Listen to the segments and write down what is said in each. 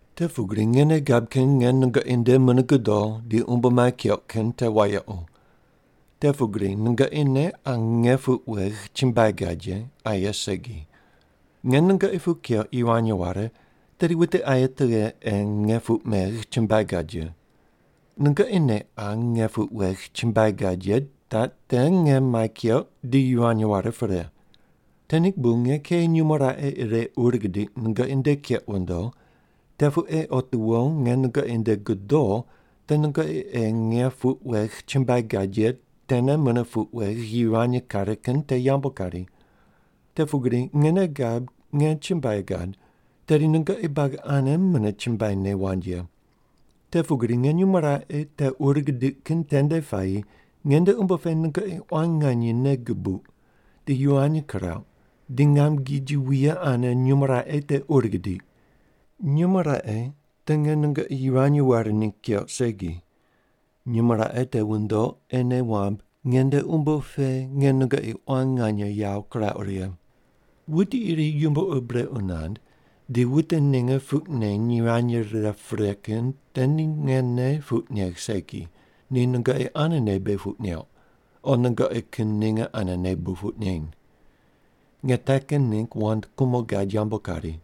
Te pugri nge nei gab kin nge nungoqi nde mune godo di umbo mai keuq kin te wayequ. Te pugri nungoqi ne qa nge puq wegh chumbuai gad ye, aye segi. Nge nungoqi puq keuq yivany ware, tedi wute aye tughe ei nge puq megh chumbuai gad ye? Nungoqi ne qa nge puq wegh chumbuai gad ye taq te nge mai keuq di yivany ware pre. Te ningg bu nge kei nyumo raqe ire ur gidiq nungoqi nde keq wundo, te pu ei otiwo nge nungoqi nde godo te nungoqi ei nge puq wegh chumbuai gad ye tene mune puq wegh yivany kare kin te yambu kari. Te pugri nge nei gab nge chumbuai gad, tedi nungoqi buagi ane mune chumbuaine wand ye. Te pugri nge nyumo raqe te ur gidiq kin tende puayi nge nde umbo pe nungoqi quan nganye nei gubuq di yivany kirauq di ngam giji wuye ane nyumo raqe te ur gidiq. Nyumo raqe te nge nungoqi yivany ware ningg keuq segi, nyumo raqe te wundoq ei nei wamb nge nde umbo pe nge nungoqi quan nganye yawo kirauq righe. Wuti iri yumbo ur brequ nand di wute ninge puq neny yivany rire pre kin te ni ngene puq negh segi, ni nungoqi anene bu puq neuq, o nungoqi kin ninge anene bu puq neny. (Nge te kin ningg wand kumo gad yambu kari.)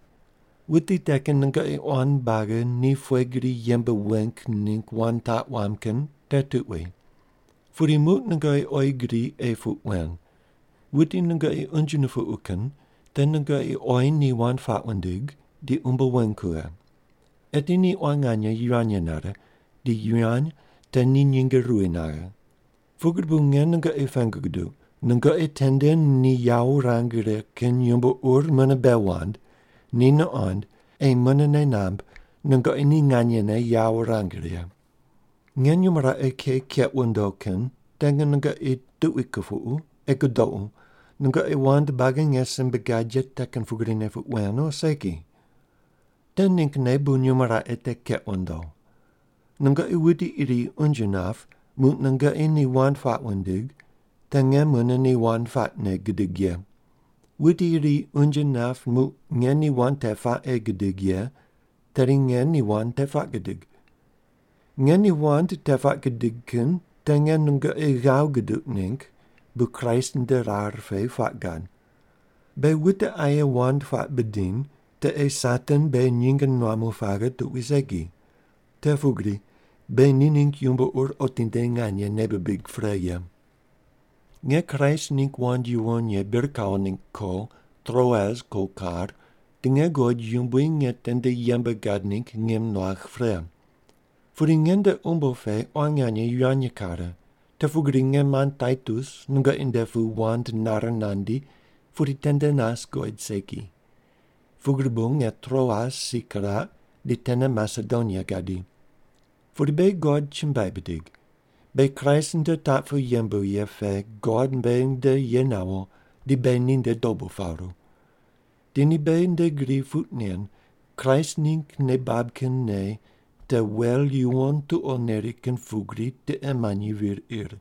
Wuti te kin nungoqi quan buagi ni pughe gri yembe weng ningg wand taq wamb kin te tuqui. Pudi muq nungoqi oyi gri ei puq wen, wuti nungoqi unje nupuqu kin te nungoqi oyi ni wand puaq wundig di umbo weng kughe. Eti ni quan nganye yivany nare di yivany te ni nyinge ruwi naghe. Pugri bu nge nungoqi pengu guduq, nungoqi tende ni yawo wurang righe kin yumbo ur mune bei wand ni nuqond ei mune nei namb nungoqi ni nganyene yawo wurang righe. Nge nyumo raqe kei keq wundo kin te nge nungoqi tuqui kupuqu ei gudoqu nungoqi wand buagi nge simbe gad ye te kin pugrine puq wen o segi. Te ninggne bu nyumo raqe te keq wundo. Nungoqi wuti iri unje nap muq nungoqi ni wand puaq wundig, te nge mune ni wand puaqne gidig ye. Wuti iri unje nap muq nge ni wand te puaq ei gidig ye, tedi nge ni wand te puaq gidig. Nge ni wand te puaq gidig kin te nge nungoqi ghav guduq ningg bu Kraist nde rar pe puaq gad. Beghi wute aye wand puaq bidiny te ei Satan beghi nyinge nuamu paghe tuqui segi. Te pugri beghi ni ningg yumbo ur otinde nganye nei bibig pre ye. Nge Kraist ningg wand yuwon ye bir kawo ningg ko Troas ko kar di nge guqod Yumbui nge tende yembe gad ningg ngim nuagh pre. Pudi nge nde umbo pe quan nganye yivany kare, te pugri nge mand Taitus nungoqi nde pu wand nare nandi pudi tende nas guqoid segi. Pugri bu nge Troas si kiraq di tene Masedonia gadi. Pudi beghi God chumbuai bidig. Beghi Kraist nde taq pu yembu ye pe God beghi nde ye nawo di beghi ninde dobu paru. Di ni beghi nde gri puq nen Kraist ningg nei bab kin nei te wel yuwon tuqo neri kin pugri tiqe manyi vir ir.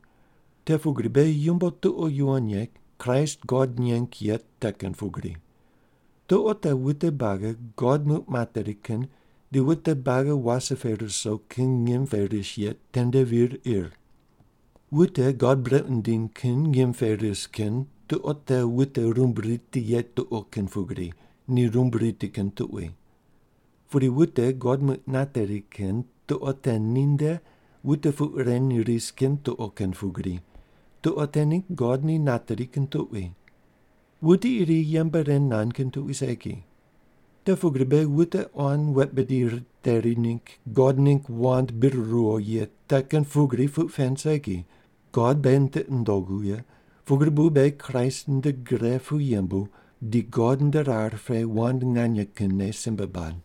Te pugri beghi yumbo tuqo yuwon ye Kraist God neng ye te kin pugri. Tuqo te wute buagi God muq nateri kin di wute buagi wase pe ruso kin ngim pe ris ye tende vir ir. Wute God brequ nindiny kin ngim pe ris kin tuqo te wute rumb riti ye tuqo kin pugri, ni rumb riti kin tuqui. Pudi wute God muq nateri kin tuqo te ni nde wute puq reny ris kin tuqo kin pugri, tuqo te ningg God ni nateri kin tuqui. Wuti iri yembe ren nand kin tuqui segi. Te pugri beghi wute quan wet bidi riteri ningg God ningg wand bir ruwo ye te kin pugri puq pen segi, God beghi tiqi nundogu ye, pugri bu beghi Kraist nde gre pu yembu di God nde rar pe wand nganye kinne simbe bad.